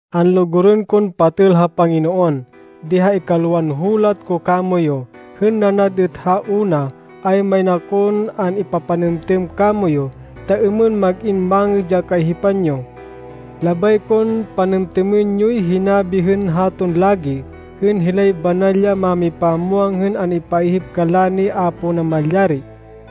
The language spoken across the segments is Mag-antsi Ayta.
Anlugurên kon patêl ha Panginoon, di ha ikalwan hulat ko kamoyu, hên nanad êt ha una, ay main akon an-ipapanêmtêm kamoyu, ta êmên mag-in mangêd ya kaihipan yo. Labay kon panêmtêmên yoy hinabi hên haton lagi, hên hilay banal ya mámipamwang hên an-ipaihip kanla ni Apo Namalyari,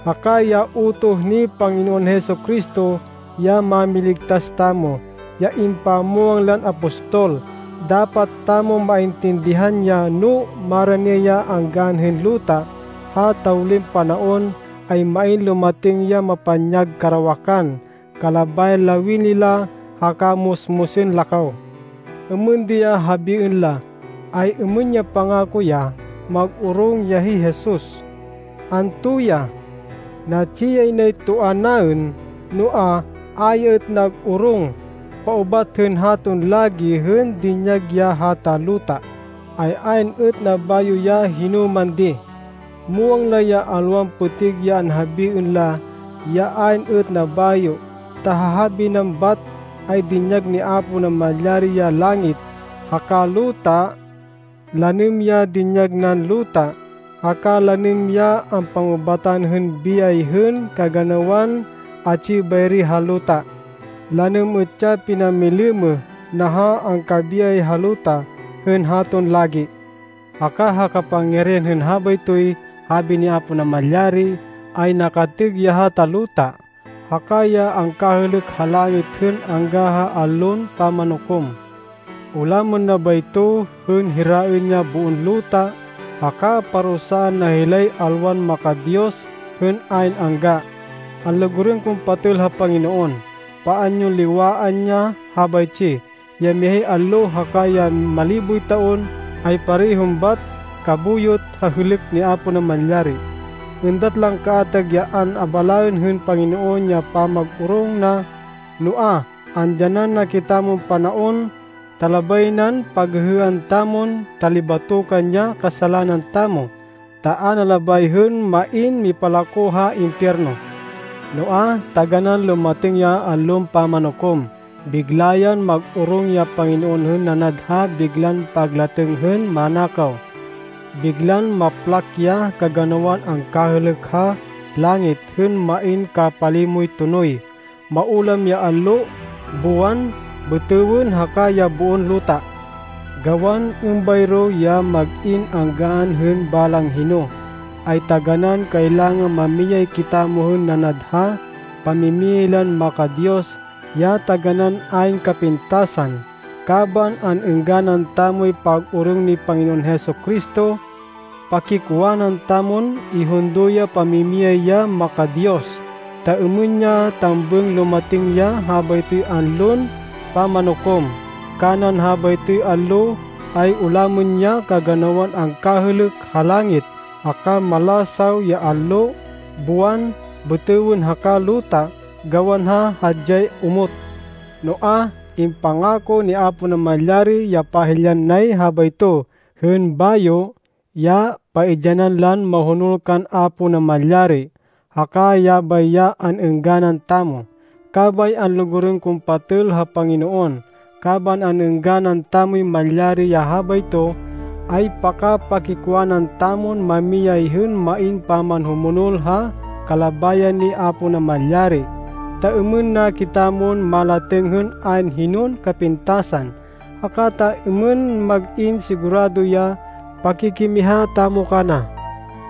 haka ya utoh ni Panginoon Jesu-Cristo, ya Mámiligtas tamo, ya impamwang lan apostol. Dapat tamon maintindihan ya, no marani ya anggaan hên luta, ha tawlin panaon, ay main lumatêng ya mapanyag karawakan kalabayan lawini la, haka musmusên la kaw. Êmên di ya habiên la, “Ay-êmên ya pangako na, ya mag-orong ya hi Jesus? Anto ya? Natsi yay nay toa naên noa, a ya êt nag-orong! Paubat hên haton lagi hên dinyag ya hata luta, ay ayn êt nabayo ya hinoman di!” Muwang la ya alwan pêtêg ya anhabiên la ya ayn êt nabayo, ta ha habi nan bat, ay dinyag ni Apo Namalyari ya langit, haka luta. Lanêm ya dinyag nan luta, haka lanêm ya ampangubatan hên biyay hên kaganawan atsi bayri ha luta. Lanêm êt ya pinamilêmêh na ha angkabiyay ha luta hên haton lagi. Haka ha kapangyarihan hên habaytoy habi ni Apo Namalyari ay nakatêg ya hata luta, haka ya angkahêlêk ha langit hên angga ha Allon Pamanukom. Ulamên na bayto hên hiraên ya boon luta haka parusaan na hilay alwan maka-Diyos hên ayn angga. Anlugurên kon patêl ha Panginoon, paan yon liwaan ya habaytsi. Ya mihay allo haka ya maliboy taon ay parehon bat kabuyot ha hêlêk ni Apo Namalyari. Êndat lan kaatag ya an-abalaên hên Panginoon ya pamag-orong na, noa, andyanan na kitamon panaon, ta labay nan paghêhêan tamon talibatokan ya kasalanan tamo, ta a na labay hên main mipalako ha impiyerno. Noa, taganán lumatêng ya Allon Pamanukom. Bigla yan mag-orong ya Panginoon hên nanad ha biglan paglatêng hên manakaw. Biglan maplak ya kaganawan angkahêlêk ha langit hên main kapalimoy tonoy. Maulam ya allo, buwan, bêtêwên haka ya boon luta. Gawan êmbayro ya mag-in anggaan hên balang hino, ay taganán kailangan mamiyay kitamo hên nanad ha pamimiyay lan maka-Diyos ya taganán ayn kapintasan, kaban an-êngganan tamoy pag-orong ni Panginoon Jesu-Cristo. Pakikwanan tamon ihundo ya pamimiyay ya maka-Diyos, ta êmên ya tambêng lumatêng ya habaytoy Allon Pamanukom. Kanan habaytoy allo, ay ulamên ya kaganawan angkahêlêk ha langit haka malasaw ya allo, buwan, bêtêwên haka luta gawan ha hadyay omot! Noa, impangako ni Apo Namalyari ya pahilyan nay habayto hên bayo, ya paidyanan lan mahonol kan Apo Namalyari, haka yabay ya an-êngganan tamo. Kabay anlugurên kon patêl ha Panginoon, kaban an-êngganan tamoy malyari ya habayto, ay paka-pakikwanan tamon mamiyay hên main pamanhumonol ha kalabayan ni Apo Namalyari, ta êmên na kitamon malatêng hên ayn hinon kapintasan, haka ta êmên mag-in sigurado ya pakikimiha tamo kana.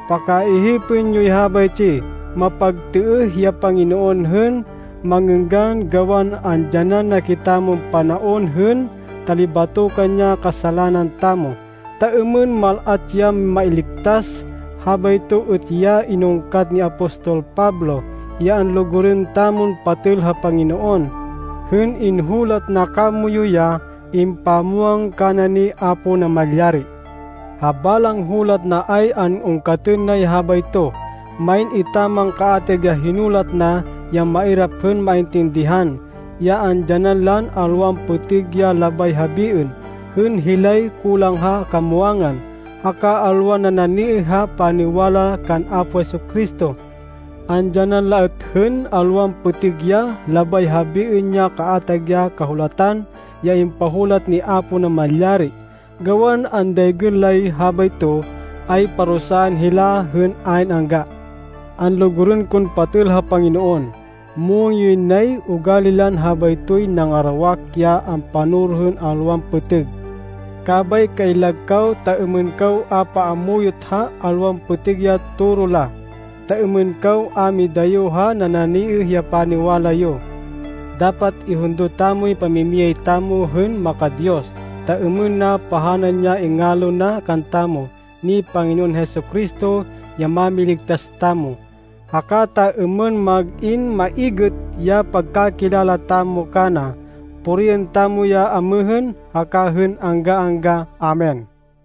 Pakaihipên yoy habaytsi, mapagtêêh ya Panginoon hên mangênggan gawan andyanan na kitamon panaon hên talibatokan ya kasalanan tamo, ta êmên mal-at ya mailigtas. Habayto êt ya inungkat ni apostol Pablo, ya anlugurên tamon patêl ha Panginoon, hên inhulat na kamoyu ya impamwang kana ni Apo Namalyari. Ha balang hulat na ay an-ungkatên nay habayto. Main etaman kaatag ya hinulat na ya mairap hên maintindihan, ya andyanan lan alwan pêtêg ya labay habiên, hên hilay kulang ha kamwangan, haka alwan nananiêh ha paniwala kan Apo Jesu-Cristo. Andyanan la êt hên alwan pêtêg ya labay habiên ya kaatag ya Kahulatan ya impahulat ni Apo Namalyari. Gawan andaygên lay habayto, ay parusaan hila hên ayn angga. Anlugurên kon patêl ha Panginoon, muwang yoy nay ugali lan habaytoy nangarawak ya ampanoro hên alwan pêtêg. Kabay kaillag kaw ta êmên kaw a paamuyot ha alwan pêtêg ya toro la, ta êmên kaw a midayo ha nananiêh ya paniwala yo. Dapat ihundo tamoy pamimiyay tamo hên maka-Diyos, ta êmên na pahanan ya ingalo na kantamo ni Panginoon Jesu-Cristo ya Mámiligtas tamo, haka ta êmên mag-in maigêt ya pagkakilala tamo kana. Puriên tamo ya amêhên haka hên angga-angga! Amen!